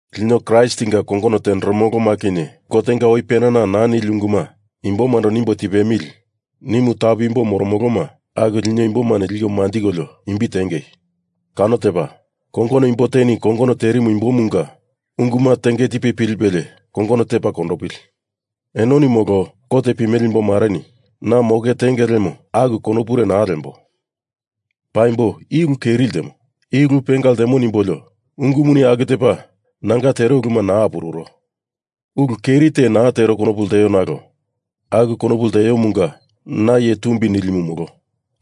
Lino Kraistinga kongono tenderemoloma kinye Gotenga oi penana naa nili unguma imbomando nimbo tipemili nimu tapu imbo moromoloma aku lino imbomani liko manjikolio imbi tiengei. Kano tepa, kongono imbo teni kongono tirimu imbomunga unguma tenge tipe pilipelie kongono tepa kondopili. Enoni molo kot pimele imbomareni na moke tenge lemo aku konopure naa lembo. Paimbo i ulu keri ltemo, i ulu penga ltemo nimbolio ungumuni aku tepa nanga tero uluma naa apururo. Ulu keri te naa tero konopu lteo nalo aku konopu lteomunga na iye tumbi nilimu molo.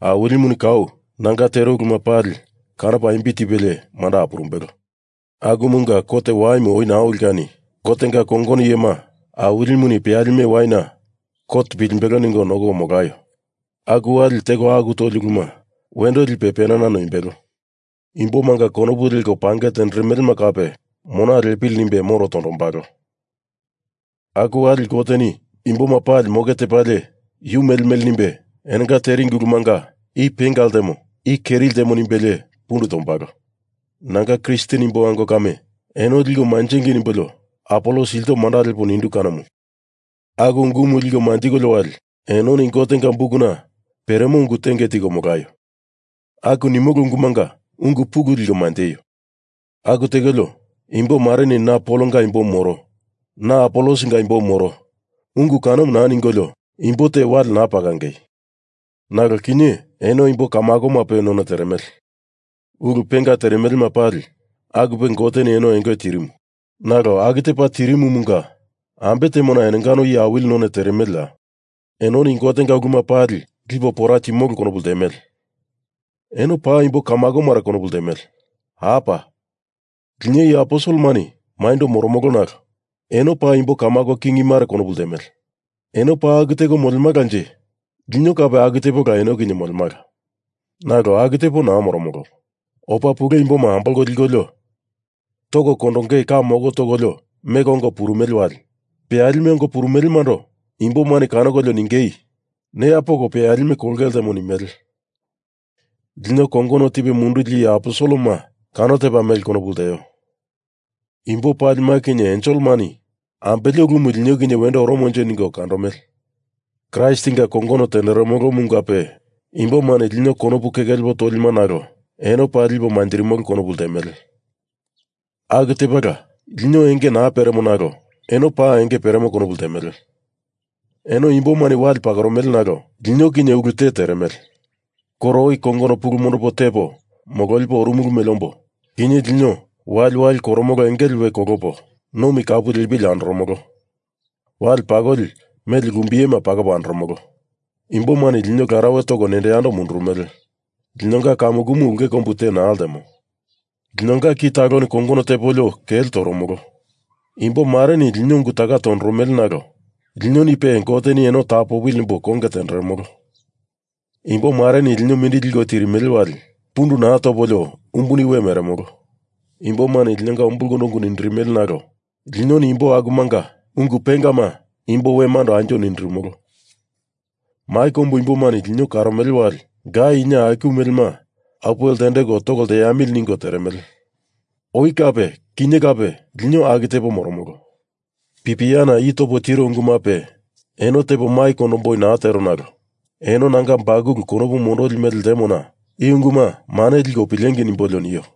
Awilimuni kau nanga tero uluma pali kanopa imbi tipelie manda apurumbelo. Akumunga kot waimu oi naa oli kani Gotenga kongono iyema Awilimuni peyalime waina kot pilimbelo ningo oi nokoko molaio. Aku wali teko alu toli uluma wendo lipe penana noimbelo. Imbomanga konopu leko pange tenderemelema kape mona lepili nimbe moro tondombalo. Aku wali Goteni imboma pali moke tepalie yu mele mele nimbe enonga teringi ulumanga i penga ltemo, i keri ltemo nimbelie pundu tombalo. Nanga Kristen imbo ango kame, eno liko manjengei nimbolio Apolos ilto manda lepo nindu kanomu. Aku ungumu liko manjikolio wali, enoni Gotenga bukuna peremo ungu tenge tiko molaio aku nimolo ungumunga ungu pulu liko manjeio. Aku tekolio, imbo mareni na Polonga imbomu moro, na Apolosinga imbomu moro ungu kanomu naa ningolio imbo te wale naa pakangei. Nalo kinye eno imbo kamakomape none teremele. Ulu penga teremelema pali akupe eno Goteni enge tirimu. Nalo aku tepa tirimumunga ambe temona enongano iye awili none teremeleya? Enoni Gotenga uluma pali lipo pora timolo konopu ltemele. Eno paa imbo kamakomare konopu ltemele. Apa! Lino iye aposelemani maindo moromolo nalo eno paa imbo kamako kingimare konopu ltemele. Eno paa aku teko molemalanje lino kape aku tepala eno kinye molemala. Nalo aku tepo naa moromolo. Opa pule imboma ambolko likolio toko kondongei ka moko tokolio meko ongo purumele wali peyalime ongo purumelemando imbomani kanokolio ningei neya poko peyalime kolonge ltemo nimele. Lino kongono tipe munduli iye aposelema kano tepa mele konopu lteo. Imbo palima kinye enselemani ambele ulumu lino kinye wendo oromonje ningo kandomele. Kraistinga kongonomu tenderemolomungape imbomani lino konopu keke lepo tolima nalo eno paa lipo manjirimolo konopu ltemele. Aku tepala lino enge naa peremo nalo eno paa enge peremo konopu ltemele. Eno imbomani wale pakoromele nalo lino kinye ulu te teremele. Koro oi kongono pulu mondopo tepo mololipo orumulu mele ombo kinye lino waliwali koromolo engele we kolopo nomi kapu lepili andoromolo. Wale pakoli mele lumbiyema pakopo andoromolo. Imbomani lino larauwe toko nendo yando mundurumele. Linonga kamukumu ulke kombu te naa ltemo. Linonga ki taloni kongono tepolio kele toromolo. Imbo mareni lino ungu taka tondoromele nalo linonipe Goteni eno tapopili nimbo konge tenderemolo. Imbomareni lino mindili liko tirimele wali pundu naa topolio umbuni we meremolo. Imbomani linonga ungu umbulkondo nindirimele nalo linoni imbo akumanga ungu pengama imbo wemando anjo nindirimolo. Mai kombu imbomani lino karomele wali, gai ina aiku melema apuwe ltendeko toko lteamili ningo teremele. Oi kape kinye kape lino aku tepo moromolo. Pipiana i topo tiro ungumape eno tepo mai kondomboi naa tero nalo eno nanga bakulu konopu mondoli mele ltemona i unguma mane liko pilengei nimbolio nio.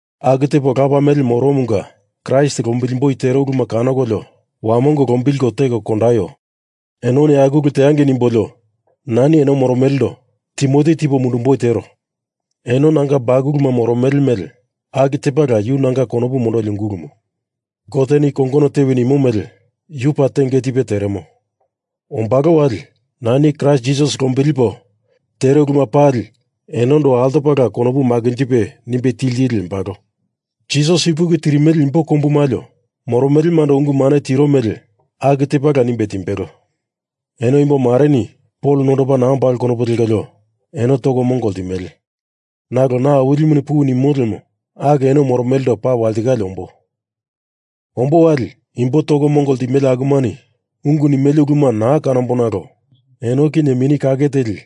Aku tepo lapa mele moromunga Kraist lombilimboi tero uluma kanokolio wamongo lombilko teko kondaio. Enoni aku ulu teangei nimbolio nani eno moromelendo Timoti tipo mundumboi tero. Eno nanga bakuluma moromele mele aku tepala yu nanga konopu mondoli ungulumu. Goteni kongono tewi nimo mele yu paa tenge tipe teremo. Ombalo wali, nani Kraist Jisas lombilipo tero uluma pali enondo altopala konopu makinjipe nimbe tili tili lembalo. Jisas ipuki tirimele imbo kombu malio moromelemando ungu mane tiro mele aku tepala nimbe timbelo. Eno imbo mareni Pol nondopa naa ombalo konopu lekolio eno toko mongo ltimele. Nalo na Awilimuni puwi nimo lemo aku eno moromelendo paa walitikale ombo. Ombo wali imbo toko mongo ltimele akumani ungu nimele uluma naa kanamboi nalo eno kinye Mini Kake Teli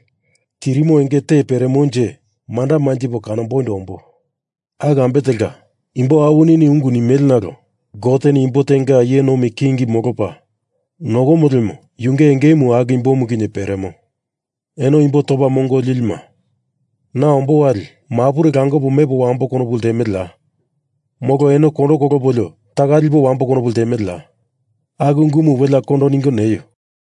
tirimo enge te peremonje manda manjipo kanomboindo ombo. Aku ambe telka, imbo awinini ungu nimele nalo Goteni imbo tenga iye nomi king molopa nokomo lemo yunge engemu aku imbomu kinye peremo. Eno imbo topa mongo lilima na ombo wali mapure langopo mepo wambo konopu ltemeleya? Molo eno kondo kolopolio taka lipo wambo konopu ltemeleya? Aku ungumu welea kondo ningo neio.